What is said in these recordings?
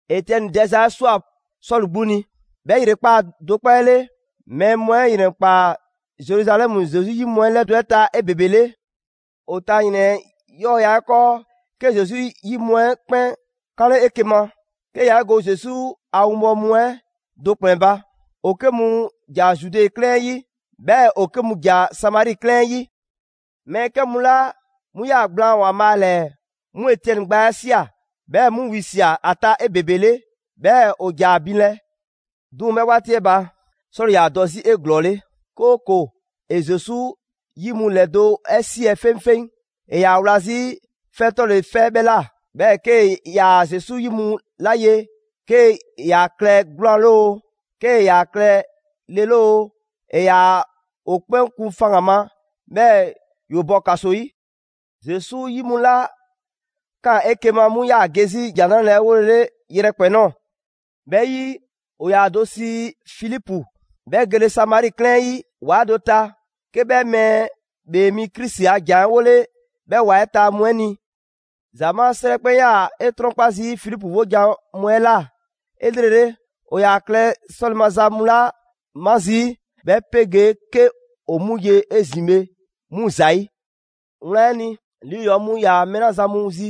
Etiɛni dɛza 'ɛ ꞊swa Sɔlu 'gbu ni. 'Bhɛ ‑yrekpaa' do 'kpɔ 'ɛ 'le, mɛɛ mu 'ɛ ‑yrɛnkpaa Zeruzalɛmu Zesu 'yi mu ‑lɛdo' 'ɛ ta 'ebebele. ‑O ta ‑yrɛn 'ɛ 'yɔɔya‑ 'ɛ 'kɔɔ 'ke Zesu 'yi mu 'ɛ 'kpɛn 'kanle 'eke‑ ma 'ke yaa 'e go Zesu a winbɔwo mu 'ɛ do ‑kplɛn ba. ‑O 'ke mu ‑ja Zude 'klɛɛn 'ɛ 'yi, 'bhɛɛ‑ ‑o 'ke mu ‑ja Samari 'klɛɛn 'ɛ 'yi. Mɛɛ 'kɛ mu 'la 'mu ꞊yaa gblaan ‑Waanbhaa' ‑lɛɛ, 'mu Etiɛni gbaa 'ɛ ꞊sia, 'bhɛɛ‑ 'mu wisia꞊ ‑a ta 'ebebele, 'bhɛɛ‑ ‑o ‑ja ‑a binlɛ. 'Duŋ‑ 'bhɛ 'waati 'ɛ ba, Sɔlu 'yaa‑ dɔ 'zi 'eglɔɔle, 'kooko‑ ‑e Zesu 'yi mu ‑lɛdo' 'ɛ siɛ 'feŋfeŋ. ‑E ‑yaa wla 'zi 'fɛ 'tɔle‑ 'fɛ 'bhɛ ꞊la, 'bhɛɛ‑ 'kee‑ ‑yaa Zesu 'yi mu 'la ye, 'kee‑ ‑yaa klɛ 'gwlaan‑ 'le oo, 'kee‑ ‑yaa klɛ le 'le oo, ‑e ‑yaa ‑o 'kpɛn kun faŋgan‑ ma, 'bhɛɛ‑ ‑yoo bɔ ‑kaso 'yi. Zesu 'yi mu 'la ꞊kaan 'eke‑ ma, 'mu ‑yaa ge 'zi ‑Jan 'Nrale‑ 'ɛ 'wolele yrɛkpɛn‑ ꞊nɔɔ. 'Bhɛ 'yi, ‑o ‑yaa ‑o do sii Filipu, 'bhɛ gele Samari 'klɛɛn 'ɛ 'yi ‑wa do ta, 'ke 'bhɛ Mɛɛ ‑Bhee Mi Krisi a ‑jan 'ɛ 'wole 'bhɛ ‑wa 'ɛ ta mu 'ɛ ni. ‑Zamaa' 'srɛ 'kpɛn 'yaa‑ 'e 'trɔnkpa zii' Filipu 'wojan‑ mu 'ɛ ꞊la 'elrele, ‑o ‑yaa ‑a klɛ 'sɔle‑ maza mu 'la 'ma zii', 'bhɛ 'pegee 'ke ‑o 'mu 'ye 'ezin‑ bhe 'mu ‑zayi'. Wlan 'ɛ ni, lii ‑yɔɔ' mu ‑yaa mɛɛ 'la zan mu zi,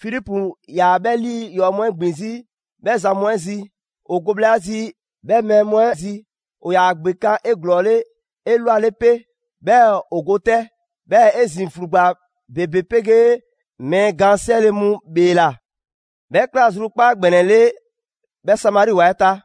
Filipu ‑yaa 'bhɛ lii ‑yɔɔ' mu 'ɛ ‑gbin 'zi 'bhɛ zan mu 'ɛ zi. ‑O go bhla zi 'bhɛ mɛɛ mu 'ɛ zi, ‑o ‑yaa ‑gbekan' 'eglɔɔle 'elwale 'pe, 'bhɛɛ‑ ‑o go 'tɛ. 'Bhɛɛ‑ 'ezin‑ ‑flugba ‑bebe 'pegee mɛɛ gaan 'siɛle‑ mu ‑bheela. 'Bhɛ꞊kla zrukpaaza ‑gbɛnɛ 'le 'bhɛ Samari ‑wa 'ɛ ta.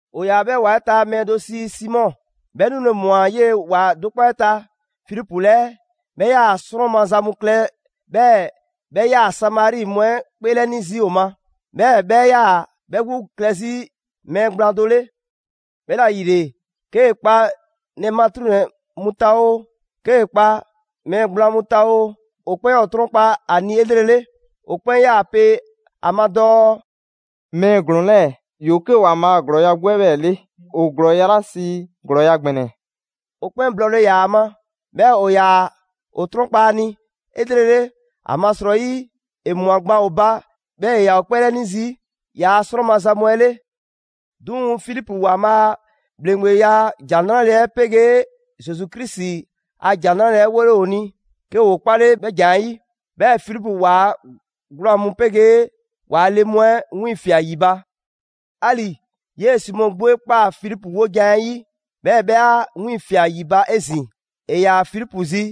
‑O ‑yaa 'bhɛ ‑wa 'ɛ ta mɛɛ do sii Simɔ. 'Bhɛ 'nule‑ ꞊mwa 'yee‑ ‑wa do 'kpɔ 'ɛ ta Filipu 'lɛɛ. 'Bhɛ 'yaa‑ 'srɔn maza mu klɛ 'bhɛɛ‑ 'bhɛ 'yaa‑ Samari mu 'ɛ 'kpeelɛni zii' ‑o ma. 'Bhɛɛ‑ 'bhɛ 'yaa‑ 'bhɛ 'gbu klɛ 'zi mɛɛ gblaan do 'le. 'Bhɛla‑ ‑yile, 'kee‑ kpa ‑nɛ matruŋnɛ mu ta oo, 'kee‑ kpa mɛɛ gblaan mu ta oo, ‑o 'kpɛn 'yaa‑ ‑o 'trɔnkpa ‑a ni 'elrele. ‑O 'kpɛn 'yaa‑ pe ‑a ma dɔɔ: «Mɛɛ ‑glɔɔn 'lɛɛ‑ ‑yoo 'ke ‑Waanbhaa' a ‑glɔɔya' 'gbu 'ɛ 'bhɛɛ‑ 'le, ‑o ‑glɔɔya' 'la sii: ‹‑Glɔɔya' ‑gbɛnɛ›.» ‑O 'kpɛn blɔɔle ‑yaa ‑a ma, 'bhɛɛ‑ ‑o ‑yaa ‑o 'trɔnkpa‑ ‑a ni 'elrele. ‑Amasrɔyi ‑e ꞊mwa gban ‑o ba 'bhɛɛ‑ ‑e ‑yaa ‑o 'kpeelɛni zii' ‑yaa' 'srɔn maza mu 'ɛ 'le. 'Duŋ‑ Filipu ‑Waanbhaa' a ‑bhleŋgbeya ‑Jan 'Nrale‑ 'ɛ 'pegee Zesu Krisi a ‑Jan 'Nrale‑ 'ɛ 'wole‑ ‑o ni, 'ke ‑woo 'kpale 'bhɛ ‑jan 'ɛ 'yi. 'Bhɛɛ‑ Filipu ‑waa' 'gwlaan‑ mu 'pegee ‑waa' le mu 'ɛ wiiŋfia꞊ ‑yi ba. 'Ali‑ 'yee‑ Simɔ 'gbu 'e ꞊kpaa Filipu 'wojan‑ 'ɛ 'yi, 'bhɛɛ‑ 'bhɛ 'a 'wiiŋfia꞊ ‑yi ba 'ezin‑; ‑e ‑yaa Filipu zi,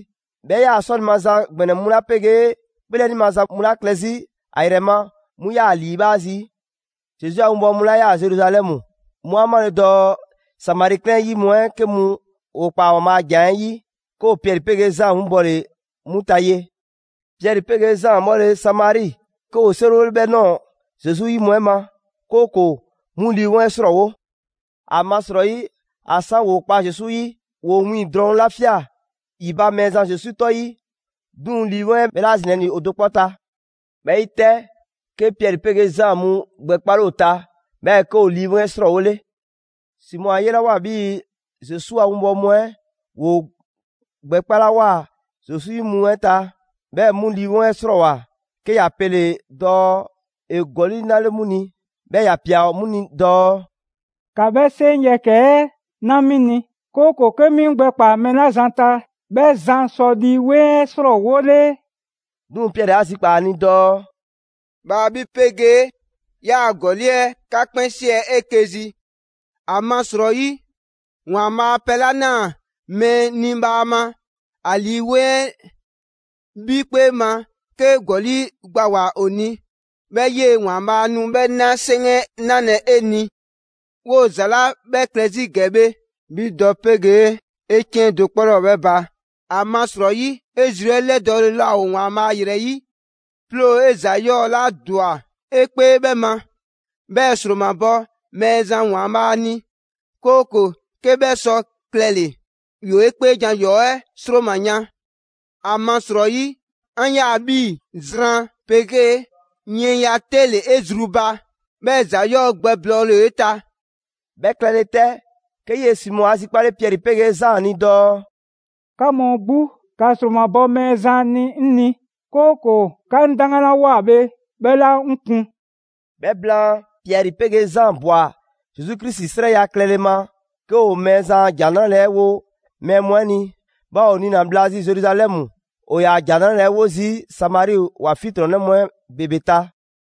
'bhɛ 'yaa‑ 'sɔle‑ maza ‑gbɛnɛ mu 'la 'pegee 'kpeelɛni maza mu 'la klɛ 'zi ‑a ‑yrɛ ma, 'mu 'yaa‑ ‑a ‑liibhaa' zii'. Zesu a 'winbɔwo mu 'la 'yaa‑ Zeruzalɛmu, 'mu 'a 'male‑ dɔɔ Samari 'klɛɛn 'ɛ 'yi mu 'ɛ 'ke mu ‑o ꞊kpaa ‑Waanbhaa' a ‑jan 'ɛ 'yi, 'ke ‑o Piɛri 'pegee Zaan 'winbɔle 'mu ta ye. Piɛri 'pegee Zaan 'bhɔle‑ Samari, 'ke ‑woo 'seriwole 'bhɛ ꞊nɔɔ Zesu 'yi mu 'ɛ ma, 'kooko‑ 'mu Lii 'Weŋ 'ɛ 'srɔɔwo. ‑Amasrɔyi ‑a 'san ‑woo kpa Zesu 'yi, ‑woo wiiŋ‑ drɔŋ ‑la ꞊fia ‑yi ba Mɛɛzan Zesu 'tɔ 'yi, 'duŋ‑ Lii 'Weŋ 'ɛ 'bhɛ 'laa zinalɛ ‑li ‑o do 'kpɔ ta. 'Bhɛ 'yi 'tɛ, 'ke Piɛri 'pegee Zaan 'mu gbɛkpale ‑o ta, 'bhɛɛ‑ 'ke ‑o Lii 'Weŋ 'ɛ 'srɔɔwole. Simɔ 'a 'yelawoa 'bhii‑ Zesu a winbɔwo mu 'ɛ ‑woo gbɛkpalawoa Zesu 'yi mu 'ɛ ta, 'bhɛɛ‑ 'mu Lii 'Weŋ 'ɛ 'srɔɔwoa‑; 'ke ‑ya pele‑ dɔɔ ‑e ‑gɔli' 'nale‑ 'mu ni. 'Bhɛɛ‑ ‑ya ꞊pia 'mu ni dɔɔ: «‑Ka 'bhɛ 'seŋ yɛkɛ‑ 'ɛ 'na 'mi ni, 'kooko‑ 'ke 'mi 'ŋ gbɛkpaa‑ mɛɛ 'la zan ta 'bhɛ zan sɔ Lii 'Weŋ 'ɛ 'srɔɔwole.» 'Duŋ‑ Piɛri 'a zikpaa‑ ‑a ni dɔɔ: «Bhaa 'bhi 'pegee 'yaa‑ ‑gɔli' 'ɛ 'ka 'kpɛn 'siɛ 'eke‑ zi; ‑amasrɔyi, Waanbhaa' pɛ 'la na mɛɛ ni bhaama, ‑a Lii 'weŋ 'ɛ, 'bhi 'kpee ma, 'kee‑ ‑gɔli' gbawoa‑ 'o ni, 'bhɛɛ‑ 'yee ‑Waanbhaa' nu 'bhɛ 'na 'seŋ 'ɛ 'nalɛ‑ 'e ni. 'Woo‑ ‑za 'la 'bhɛ klɛ 'zi ‑gɛ bhe, 'bhi dɔ 'pegee 'e 'ciɛn do 'kpɔ 'laa ‑o 'bhɛ ba; ‑amasrɔyi 'e zru 'ɛ 'lɛdɔɔle laa ‑o ‑Waanbhaa' ‑yrɛ 'yi. 'Ploo‑ 'e ‑za 'yɔɔ‑ 'la ‑dwa 'e 'kpee 'bhɛ ma, 'bhɛɛ‑ ‑sromabɔ Mɛɛzan ‑Waanbhaa' ni, 'kooko‑ 'ke 'bhɛ sɔ klɛle‑, ‑yoo 'e 'kpeejan‑ ‑yɔɔ' 'ɛ ‑sroma yan. ‑Amasrɔyi 'an ꞊ya 'bhii‑ zran 'pegee yiɛnya 'te ‑le 'e zru ba, 'bhɛɛ‑ ‑za 'yɔɔ‑ gbɛblɔɔle ‑o 'e ta.» 'Bhɛ klɛle 'tɛ, 'ke 'yee‑ Simɔ 'a zikpale Piɛri 'pegee Zaan ni dɔɔ: «'Ka mu 'gbu, ‑ka ‑sromabɔ Mɛɛzan ni 'ŋ ni, 'kooko‑ 'ka 'daŋgan 'la ꞊woa bhe, 'bhɛ 'laa 'ŋ kun.» 'Bhɛ blaan, Piɛri 'pegee Zaan ꞊bwa Zesu Krisi 'srɛya‑ klɛle ma 'ke ‑o Mɛɛzan a ‑Jan 'Nrale‑ 'ɛ wo mɛɛ mu 'ɛ ni. 'Bhɛɛ‑ ‑o niina‑ bhla zi Zeruzalɛmu, ‑o ‑yaa ‑Jan 'Nrale‑ 'ɛ 'wo zii' Samari ‑wa 'fiɛntrɔnnɛ mu 'ɛ ‑bebe ta.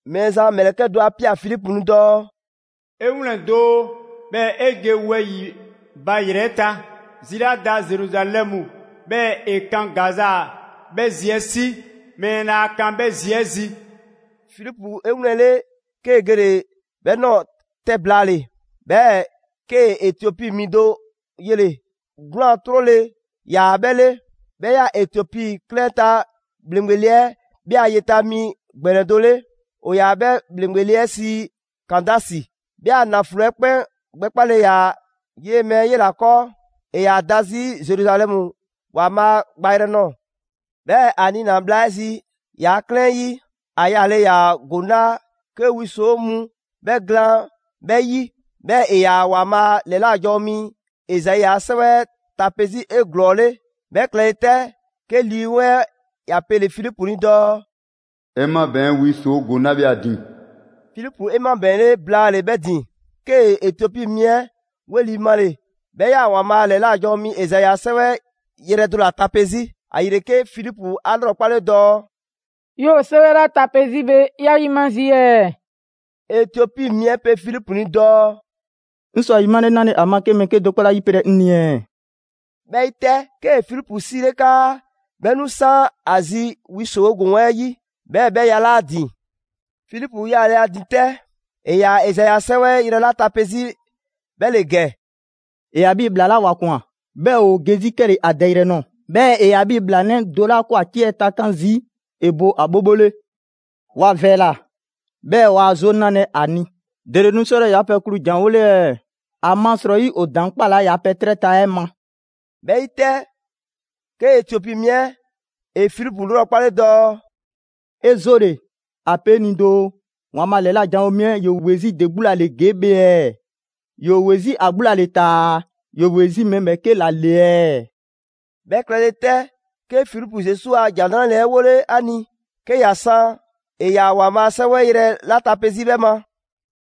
Mɛɛzan a ‑mlɛkɛ' do 'a ꞊pia Filipu ni dɔɔ: «'E 'wlɛn‑ doo, 'bhɛɛ‑ 'e ge wɛyi‑ ba ‑yrɛ ta. Zi 'la da Zeruzalɛmu, 'bhɛɛ‑ ‑e kan Gaza, 'bhɛ zi 'ɛ 'si, mɛɛ laa kan 'bhɛ zi 'ɛ zi.» Filipu 'e 'wlɛnle‑, 'kee‑ gele‑ 'bhɛ ꞊nɔɔ 'tɛ blaale‑, 'bhɛɛ‑ 'kee‑ Etiopi mi do yele‑, 'gwlaan‑ ‑trɔ ‑le ‑yaa 'bhɛ 'le. 'Bhɛ 'yaa‑ Etiopi 'klɛɛn 'ɛ ta ‑bhleŋgbe le 'ɛ 'bhɛ a yeta mi ‑gbɛnɛ do 'le. ‑O ‑yaa 'bhɛ ‑bhleŋgbe le 'ɛ sii Kandasi. 'Bhɛ a ‑naflo 'ɛ 'kpɛn gbɛkpale ‑yaa 'yee‑ mɛɛ 'ɛ 'yela‑ 'kɔɔ. ‑E ‑yaa da 'zi Zeruzalɛmu ‑Waanbhaa' gbayrɛ nɔɔ‑. 'Bhɛɛ‑ ‑a niina‑ bhla 'ɛ zi ‑yaa' 'klɛɛn 'ɛ 'yi, ‑a yaale ‑yaa ‑goŋ 'la 'ke wi ‑soo' mu 'bhɛ glaan 'bhɛɛ‑ 'yi, 'bhɛɛ‑ ‑e ‑yaa ‑Waanbhaa' ‑lɛla' janwo mi Ezai 'a 'sɛwɛ 'ɛ tape 'zi 'eglɔɔle. 'Bhɛ klɛle 'tɛ, 'ke Lii 'Weŋ 'ɛ ‑ya pele‑ Filipu ni dɔɔ: «'E 'mabɛɛn‑ wi ‑soo' ‑goŋ 'la bhe ‑a ‑din!» Filipu 'e 'mabɛɛnle blaale‑ 'bhɛ ‑din, 'kee‑ Etiopi mi 'ɛ 'weli‑ male‑; 'bhɛ 'yaa‑ ‑Waanbhaa' ‑lɛla' janwo mi Ezai a 'sɛwɛ 'ɛ yrɛ do ‑la tape 'zi. ‑Ayile 'ke Filipu 'a 'lrɔkpale dɔɔ: «'Yoo‑ 'sɛwɛ 'la tape 'zi bhe 'ya 'yima zii' ɛɛ?» Etiopi mi 'ɛ pe Filipu ni dɔɔ: «'Ŋ sɔ ‑a ‑yimale 'nale‑ ‑a ma 'ke mɛɛ 'kedo‑ 'kpɔ 'laa ‑yipelɛ 'ŋ ni ɛɛ?» 'Bhɛ 'yi 'tɛ, 'kee‑ Filipu 'siile 'kaa 'bhɛ 'nu 'san ‑a zi wi ‑soo' ‑goŋ 'ɛ 'yi, 'bhɛɛ‑ 'bhɛ yalaa' ‑a ‑din. Filipu ‑yalaa' ‑a ‑din 'tɛ. ‑E ‑yaa Ezai 'a 'sɛwɛ yrɛ 'la tape 'zi 'bhɛ ‑le ‑gɛ: «‑E ‑yaa 'bhii‑ ‑bhlaa 'la ‑wa ꞊kwan, 'bhɛɛ‑ ‑woo ge 'zi 'kɛle‑ ‑a dɛyrɛ nɔɔ‑, 'bhɛɛ‑ ‑e ‑yaa 'bhii‑ ‑bhlaanɛ' do 'la 'ke ‑wa ciɛ takan' zii' ‑e bo ‑a 'bhobho 'le. ‑Wa ‑vɛɛla, 'bhɛɛ‑ waa 'zoo 'nalɛ‑ ‑a ni. ‑Dele nu 'sɔlɛ‑ ‑yaa' pɛ klu ‑janwole ɛɛ? ‑Amasrɔyi ‑o ‑daŋ' 'kpalaa‑ ‑yaa' pɛ 'trɛ ta 'ɛ ma.» 'Bhɛ 'yi 'tɛ, 'ke Etiopi mi 'ɛ ‑e Filipu 'lrɔkpale dɔɔ: «'E 'zoole‑ ‑a pe 'ŋ ni doo, ‑Waanbhaa' ‑lɛla' janwo mi 'ɛ ‑yoo ‑we 'zi de 'gbu ‑la ‑le ‑gee' bhe ɛɛ? ‑Yoo ‑we 'zi ‑a 'gbu ‑la ‑le taa‑ ‑yoo ‑we 'zi mɛɛ ‑bhɛɛke' ‑la ‑le ɛɛ?» 'Bhɛ klɛle 'tɛ, 'ke Filipu Zesu a ‑Jan 'Nrale‑ 'ɛ 'wole ‑a ni; 'ke ‑ya san ‑e ‑yaa ‑Waanbhaa' 'Sɛwɛ yrɛ 'la tape 'zi 'bhɛ ma.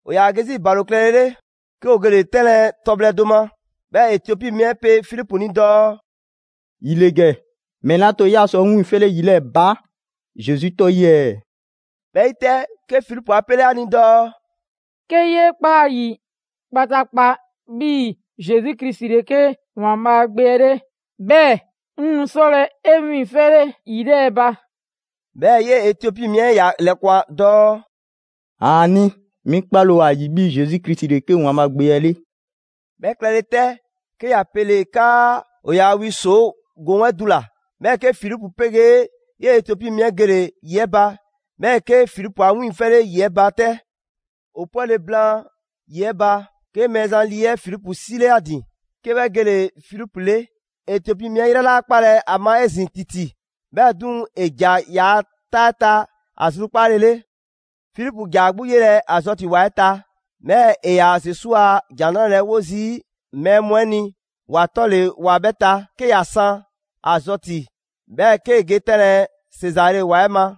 ‑O ‑yaa ge 'zi ‑balo klɛlele, 'ke ‑o gele‑ 'tɛnlɛ‑ tɔbhlɛ do ma. 'Bhɛɛ‑ Etiopi mi 'ɛ pe Filipu ni dɔɔ: «‑Yi ‑le ‑gɛ! ‑Mɛle 'a to 'bhɛɛ‑ 'yaa sɔ 'ŋ 'wiiŋfɛle ‑yi 'lɛɛ‑ ba Zesu 'tɔ 'yi ɛɛ?» ['Bhɛ 'yi 'tɛ, 'ke Filipu 'a 'pele ‑a ni dɔɔ: «'Ke 'yee ꞊kpaa ‑a ‑yi kpataakpa 'bhii‑ Zesu Krisi ‑le 'ke ‑Waanbhaa' Gbe 'ɛ 'le, 'bhɛɛ‑ 'ŋ nu 'sɔlɛ‑ 'e 'wiiŋfɛle ‑yi 'lɛɛ‑ ba.» 'Bhɛɛ‑ 'yee‑ Etiopi mi 'ɛ ‑ya ‑lɛkwan dɔɔ: «‑Aani', 'mi 'kpale‑ ‑o ‑a ‑yi 'bhii‑ Zesu Krisi ‑le 'ke ‑Waanbhaa' Gbe 'ɛ 'le.»] 'Bhɛ klɛle 'tɛ, 'ke ‑ya pele‑ 'kaa ‑o yaa wi ‑soo' ‑goŋ 'ɛ dula‑, 'bhɛɛ‑ 'ke Filipu 'pegee 'yee‑ Etiopi mi 'ɛ gele‑ ‑yi 'ɛ ba, 'bhɛɛ‑ 'ke Filipu 'a 'wiiŋfɛle ‑yi 'ɛ ba 'tɛ. ‑O 'pwɛle‑ blaan ‑yi 'ɛ ba, 'ke Mɛɛzan Lii 'ɛ Filipu 'sile 'a ‑din, 'ke 'bhɛ gele‑ Filipu 'le. Etiopi mi 'ɛ 'yrɛ 'laa 'kpalɛ‑ ‑a ma 'ezin‑ ‑titi, 'bhɛɛ‑ 'duŋ‑ ‑e ‑ja ‑yaa' 'taa 'ɛ ta ‑a zrukpaale 'le. Filipu ‑ja ‑a 'gbu 'yelɛ‑ Azɔti ‑wa 'ɛ ta. 'Bhɛɛ‑ ‑e ‑yaa Zesu a ‑Jan 'Nrale‑ 'ɛ 'wo zii' mɛɛ mu 'ɛ ni ‑wa 'tɔle‑ ‑wa 'bhɛ ta: 'ke ‑ya san Azɔti, 'bhɛɛ‑ 'kee‑ ge 'tɛnlɛ‑ Sezare ‑wa 'ɛ ma.